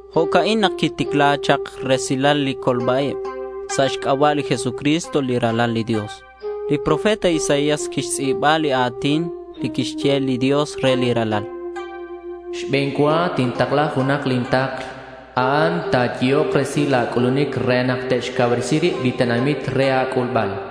Jo'ca'in nak quiticla chak resilal li colba-ib sa' xc'aba' li Jesucristo li Ralal li Dios. Li profeta Isaías quixtz'i̱ba li a̱tin li quixye li Dios re li Ralal: Xbe̱n cua tintakla junak lin takl. A'an ta̱yehok resil la̱ c'ulunic re nak te'xcauresi rib li tenamit re a̱c'ulbal.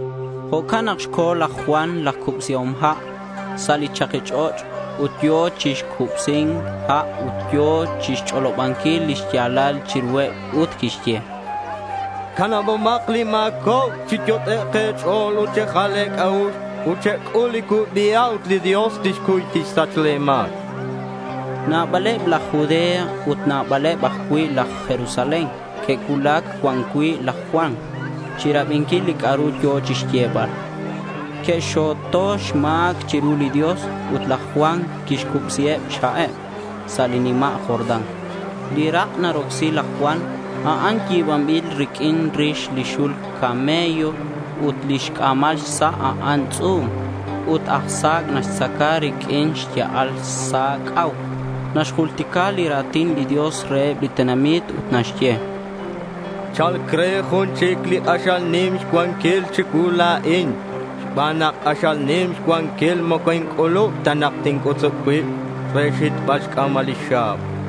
Jo'can nak co̱ laj Juan laj Cubsihom Ha' sa' li chaki ch'och' ut yo̱ chi cubsi̱nc ha' ut yo̱ chixch'olobanquil lix ya̱lal chiruheb ut quixye: —Canabomak li ma̱cobc. Chi yot'ek' e̱ch'o̱l ut chejal e̱c'a'ux ut chec'ul li cubi ha' ut li Dios tixcuy tixsach le̱ ma̱c, chan. Nabaleb laj Judea ut nabaleb ajcui' laj Jerusalén que'cuulac cuan cui' laj Juan chirabinquil li c'a'ru yo̱ chixyebal. Que'xxo̱to xma̱c chiru li Dios ut laj Juan quixcubsi xha'eb sa' li nima' Jordán. Li rak' narocsi laj Juan, a'an yi̱banbil riq'uin rix li xul camello ut lix c'a̱mal xsa', a'an tz'u̱m. Ut aj sa̱c' naxtzaca riq'uin xya'al sak c'au. Naxjultica li ra̱tin li Dios reheb li tenamit ut naxye: —Cha̱lc re jun chic li k'axal nim xcuanquil chicuu la̱in. Xban nak k'axal nim xcuanquil, moco inc'ulub ta nak tinc'utzub cuib re xhitbal xc'a̱mal lix xa̱b.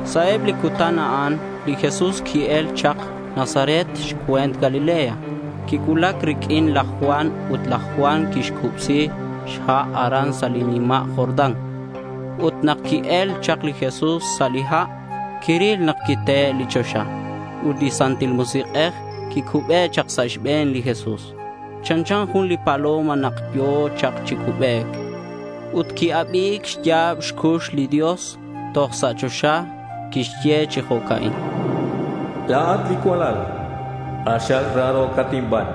Sa' eb li cutan a'an li Jesús qui-el chak Nazaret xcue̱nt Galilea. Quicuulac riq'uin laj Juan ut laj Juan quixcubsi xha' aran sa' li nima' Jordán. Ut nak qui-el chak li Jesús sa' li ha', quiril nak quiteli li choxa, ut li Santil Musik'ej quicube chak sa' xbe̱n li Jesús. Chanchan jun li paloma nak yo̱ chak chi cubec. Ut qui-abi̱c xya̱b xcux li Dios toj sa' choxa. Quixye chi jo'ca'in: —La̱at li cualal k'axal raro̱cat inban.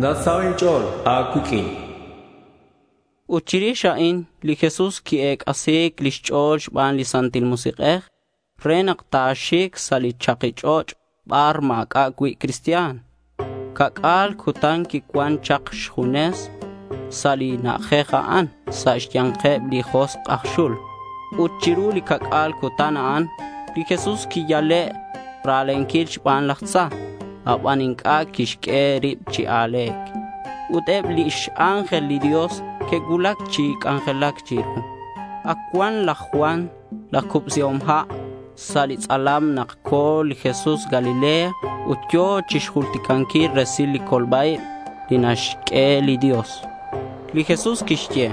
Nasaho' inch'o̱l a̱cuiq'uin, chan li Dios. Ut chirix a'in, li Jesús qui-ec'asi̱c lix ch'o̱l xban li Santil Musik'ej re nak ta̱xic sa' li chaki ch'och' bar ma̱c'a' cui' cristian. Ca'c'a̱l cutan quicuan chak xjunes sa' li na'ajej a'an sa' xya̱nkeb li josk' aj xul. Ut chiru li ca'c'a̱l cutan a'an, li Jesús quiyale' ra̱lenquil xban laj tza, aban inc'a' quixq'ue rib chi a̱le̱c. Ut eb lix ángel li Dios que'cuulac chi c'anjelac chiru. Ac cuan laj Juan laj Cubsihom Ha' sa' tz'alam nak co̱ li Jesús Galilea ut yo̱ chixjulticanquil resil li colba-ib li naxq'ue li Dios. Li Jesús quixye: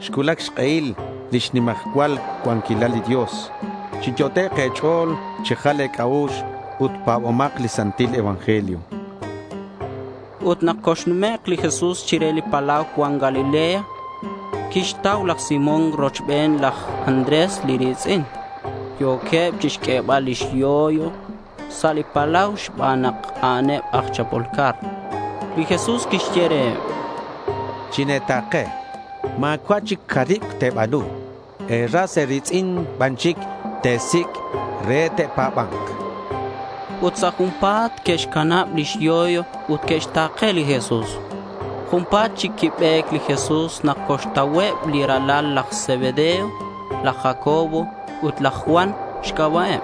—Xcuulac xk'ehil lix nimajcual xcuanquilal li Dios. Chiyot'ek' e̱ch'o̱l chejal e̱c'a'ux ut pa̱bomak li Santil Evangelio, chan li Jesús. Ut nak coxnumek' li Jesús chire li palau cuan Galilea quixtau laj Simón rochben laj Andrés li ri̱tz'in. Yo̱queb chixq'uebal lix yoy sa' li palau xban nak a'aneb aj chapol car. Li Jesús quixye reheb, —Chine̱ta̱ke. Ma̱cua' chic caribc te̱ba̱nu. E̱ras e̱ri̱tz'in ban chic te̱sic' re te'pa̱ba̱nk, chan reheb. Ut sa' junpa̱t que'xcanab lix yoy ut que'xta̱ke li Jesús. Junpa̱t chic quibe̱c li Jesús nak coxtauheb li ralal laj Zebedeo. Laj Jacobo ut laj Juan xc'aba'eb.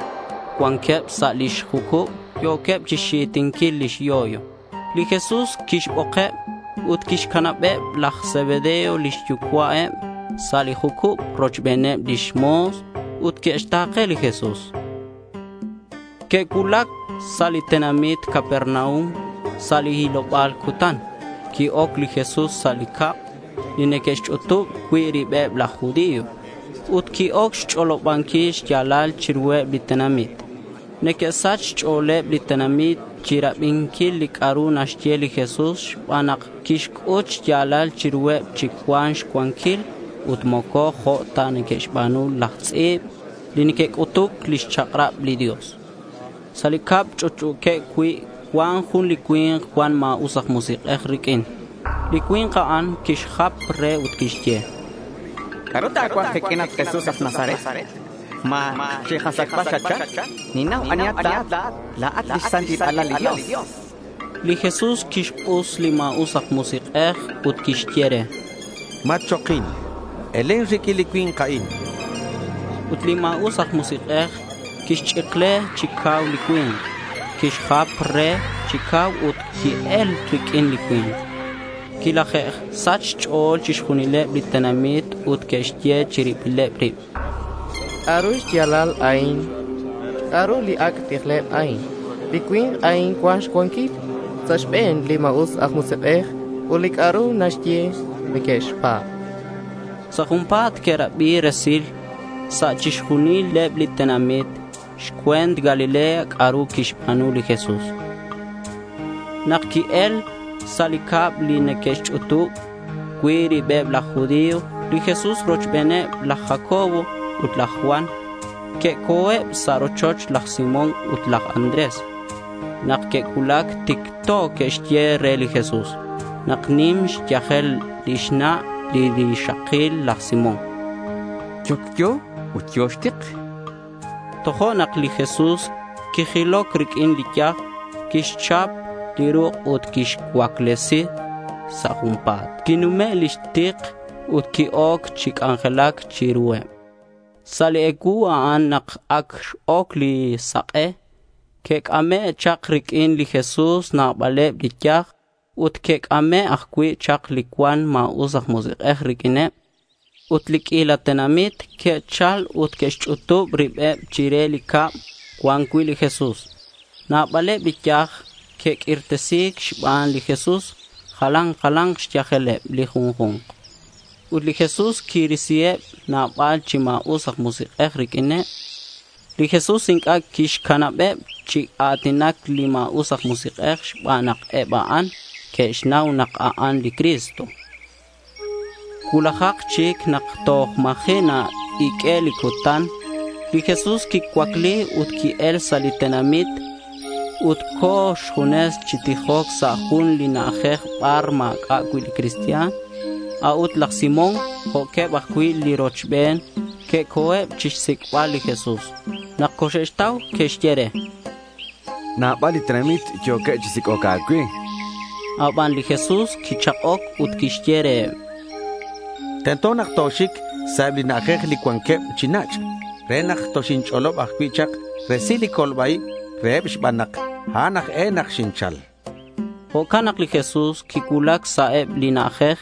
Cuanqueb sa' lix jucub. Yo̱queb chixxitinquil lix yoy. Li Jesús quixbokeb ut que'xcanab laj Zebedeo lix yucua'eb sa' li jucub rochbeneb lix mo̱s. Ut que'xta̱ke li Jesús. Que'cuulac sa' li tenamit Capernaum. Sa' li hiloba̱l cutan, qui-oc li Jesús sa' li cab li neque'xch'utub cui' ribeb laj judío. Ut qui-oc chixch'olobanquil xya̱lal chiruheb li tenamit. Neque'sach xch'o̱leb li tenamit chirabinquil li c'a'ru naxye li Jesús xban nak quixc'ut xya̱lal chiruheb chi cuan xcuanquil ut moco jo' ta que'xba̱nu laj tz'i̱b li neque'c'utuc lix chak'rab li Dios. Sa' li cab ch'utch'u̱queb cui' cuan jun li cui̱nk cuan ma̱us aj musik'ej riq'uin. Li cui̱nk a'an quixjap re ut quixye: —¿C'a'ru ta̱cuaj kiq'uin, at Jesús aj Nazaret? ¿Ma chikasachbal xatchal? Ninnau anihat la̱at. La̱at lix Santil Alal li Dios, chan. Li Jesús quixk'us li ma̱us aj musik'ej ut quixye re: —Matchokin. Elen riq'uin li cui̱nk a'in, chan. Ut li ma̱us aj musik'ej quixch'ikle chi cau li cui̱nk. Quixjap re chi cau ut qui-el riq'uin li cui̱nk. Quilaje'sach xch'o̱l chixjunileb li tenamit ut que'xye chiribileb rib: —¿C'a'ru xya̱lal a'in? ¿C'a'ru li ac' tijleb a'in? Li cui̱nk a'in cuan xcuanquil sa' xbe̱neb li ma̱us aj musik'ej ut li c'a'ru naxye, neque'xpa̱b.— Sa' junpa̱t que'rabi resil sa' chixjunileb li tenamit xcue̱nt Galilea c'a'ru quixba̱nu li Jesús. Nak que'el sa' li cab li neque'xch'utub cui' ribeb laj judío, li Jesús rochbeneb laj Jacobo ut laj Juan que'co̱eb sa' rochoch laj Simón ut laj Andrés. Nak que'cuulac, ticto que'xye re li Jesús nak nim xyajel lix na' li rixakil laj Simón. Yocyo ut yo̱ xtik. Tojo'nak li Jesús quijiloc riq'uin li yaj. Quixchap li ruk' ut quixcuaclesi. Sa' junpa̱t quinume' lix tik ut qui-oc chi c'anjelac chiruheb. Sa' li ecuu a'an nak ac x-oc li sak'e, que'c'ame' chak riq'uin li Jesús nabaleb li yaj. Ut que'c'ame' ajcui' chak li cuan ma̱us aj musik'ej riq'uineb. Ut li q'uila tenamit que'chal ut que'xch'utub ribeb chire li cab cuan cui' li Jesús. Nabaleb li yaj que'q'uirtesi̱c xban li Jesús. Jalan jala̱nk xyajeleb li junju̱nk. Ut li Jesús quirisiheb nabal chi ma̱us aj musik'ej riq'uineb. Li Jesús inc'a' quixcanabeb chi a̱tinac li ma̱us aj musik'ej xban nak eb a'an que'xnau nak a'an li Cristo. Cuulajak chic nak toj ma̱ji' na-iq'ue' li cutan, li Jesús quicuacli ut qui-el sa' li tenamit. Ut co̱ xjunes chi tijoc sa' jun li na'ajej bar ma̱c'a' cui' cristian. A'ut laj Simón jo'queb ajcui' li rochben que'co̱eb chixsic'bal li Jesús. Nak coxe'xtau que'xye re, —Nabal li tenamit yo̱queb chi sic'oc a̱cue, chanqueb. Aban li Jesús quichak'oc ut quixye reheb: —Tento nak toxic sa' eb li na'ajej li cuanqueb chi nach' re nak toxinch'olob ajcui' chak resil li colba-ib reheb xban nak a'an aj e nak xinchal, chan. Jo'can nak li Jesús quicuulac sa' eb li na'ajej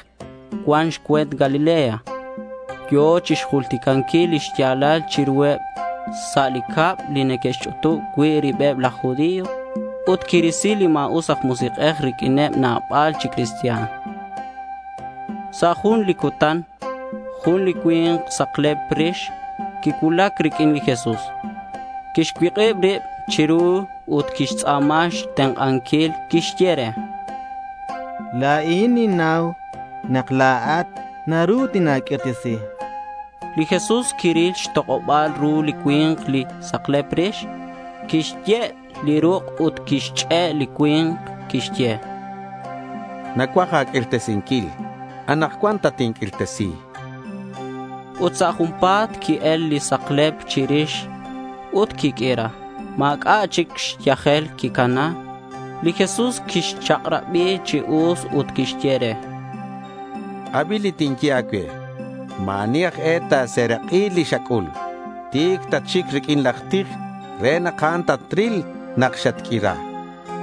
cuan xcue̱nt Galilea. Yo̱ chixjulticanquil li xya̱lal chiruheb sa' li cab li neque'xch'utub cui' ribeb laj judío, ut quirisi li ma̱us aj musik'ej riq'uineb nabal chi cristian. Sa' jun li cutan jun li cui̱nk saklep rix quicuulac riq'uin li Jesús. Quixcuik'ib rib chiru ut quixtz'a̱ma xtenk'anquil. Quixye re: —La̱in ninnau nak la̱at naru tina̱q'uirtesi, chan. Li Jesús quiril xtok'oba̱l ru li cui̱nk, li saklep rix. Quixye' li ruk' ut quixch'e' li cui̱nk. Quixye: —Nacuaj a̱q'uirtesinquil. Anakcuan tatinq'uirtesi, chan. Ut sa' junpa̱t qui-el li saklep chirix ut quiq'uira. Ma̱c'a' chic xyajel quicana. Li Jesús quixchak'rabi chi us ut quixye re: —Abi li tinye a̱cue. Ma̱ ani aj e ta̱serak'i li xac'ul. Ti̱c tatxic riq'uin laj tij re nak a'an ta̱ril nak xatq'uira.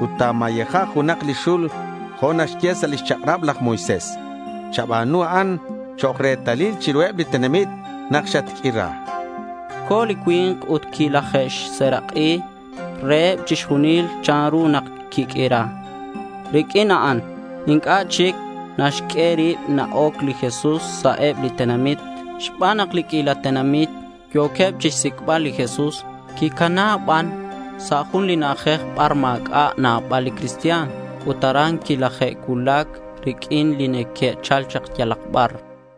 Ut ta̱mayeja junak li xul jo' naxye sa' lix chak'rab laj Moisés. Chaba̱nu a'an chok' retalil chiruheb li tenamit nak xatq'uira, chan. Co̱ li cui̱nk ut quilajxserak'i reheb chixjunil chanru nak quiq'uira. Riq'uin a'an inc'a' chic naxq'ue rib na-oc li Jesús sa' eb li tenamit xban nak li q'uila tenamit yo̱queb chixsic'bal li Jesús. Quicana ban sa' jun li na'ajej bar ma̱c'a' cui' nabal li cristian ut aran quilaje'cuulac riq'uin li neque'chal chak yalak bar.